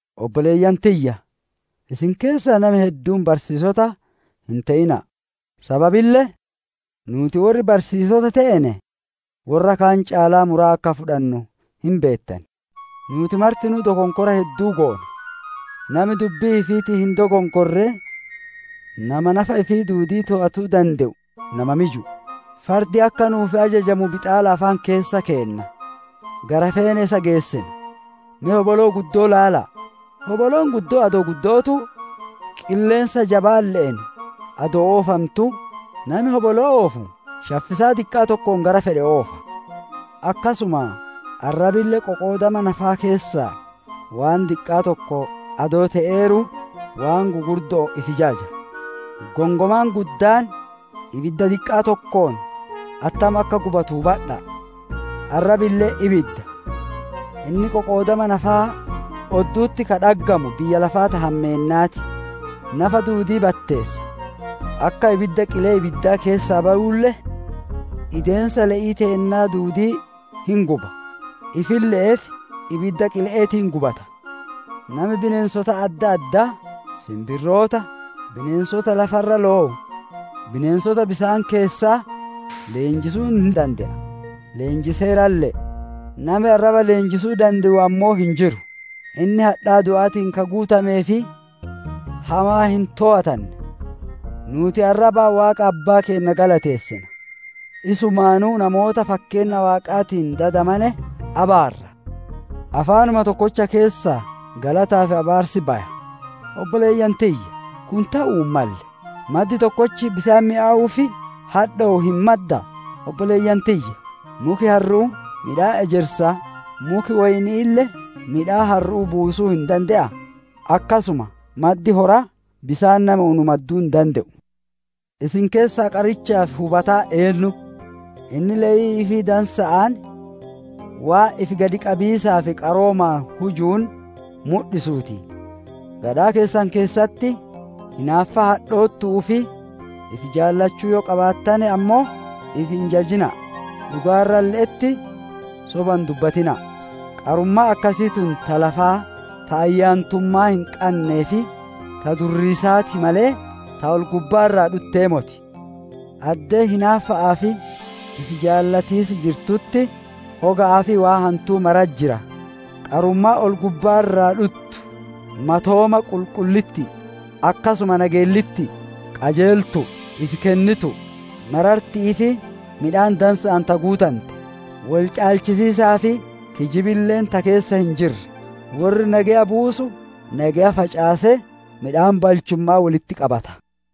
Obboleeyyan tiyya! Isin keessaa nami hedduun barsiisota hin te'ina'a. Sababille nuuti worri barsiisota teene worra kaan caalaa muraa akka fudhannu hin beettan. Nuuti martinuu dokonkora hedduu goona; nami dubbii ifiitiin hin dokonkorre, nama nafa ifii duudii toowatuu dande'u, nama miju'u. Fardi akka nu'uuf ajajamu bixaala afaan keessa keenna; gara feene isa geessina. Me hoboloo guddittii ilaala'a! Hoboloon guddoon adoo guddo'ootuu, qilleensa jabaalle'een adoo oofantuu, nami hoboloo oofu shaffisaa diqqaa tokkoon gara fedhe oofa. Akkasuma, arrabille qoqoodama nafaa keessaa waan diqqaa tokko adoo te'eeruu, waan gugurdo'oon ifi jaja. Gongomaan guddaan ibidda diqqaa tokkoon attam akka gubatu hubadha'a! Arrabille ibidda. Inni qoqoodama nafaa oddu'utti ka dhaggamu, biyya lafaa ta hammeennaa ti; nafa duudii batteessa; akka ibidda qilee ibiddaa keessaa bayuulle ideensa le'ii teennaa duudii hin guba; ifille'eef ibidda qile'eetiin gubata. Nami bineensota adda addaa, sinbirroota, bineensota lafa irra lowu, bineensota bisaan keessaa leenjisuu hin dande'a; leenjiseeralle'e. Nami arraba leenjisuu dande'u ammoo hin jiru; inni hadhaa du'aatiin ka guutamee fi hamaa hin toowatanne. Nuuti arrabaan Waaqa Abbaa keenna galateessina, isumaanuu namoota fakkeenna Waaqaatiin dadamane abaarra. Afaanuma tokkocha keessaa galataa fi abaarsi baya; obboleeyyan tiyya! Kun te'uu hin malle. Maddi tokkochi bisaan mi'owuu fi hadhowu hin maddaa? Obboleeyyan tiyya! Muki harru'uu midhaan ejersaa, muki woyni'iille midhaan harru'uu buusuu hin dande'aa? Akkasuma maddi horaa bisaan nami unu madduu hin dande'u. Isin keessaa qarichaa fi hubataan eennu? Inni le'ii ifii dansa'aan, waan ifi gadi qabiisaa fi qaroomaan hujuun mudhisuu ti. Gadhaa keessan keessatti hinaaffaa hadhoottu'uu fi ifi jaalachuu yoo qabaattane ammoo, ifi hin jajina'a! Dhugaa irralle'etti soba hin dubbatina'a! Qarummaan akkasii tun ta lafaa, ta ayyaantummaa hin qannee fi ta durriisaa ti malee, ta ol-gubbaa irraa dhuttee moti. Addee hinaaffa'aa fi ifi jaalatiis jirtutti hoga'aa fi waan hantuu maratti jira. Qarummaan ol-gubbaa irraa dhuttu matooma qulqullitti'i; akkasuma nageellitti'i, qajeeltu'u, ifi kennitu'u, mararti'ii fi midhaan dansa'aan ta guutante; wol caalchisiisaa fi kijibille ta keessa hin jirre. Worri nageya buusu, nageya facaasee, midhaan balchumma'aa wolitti qabata.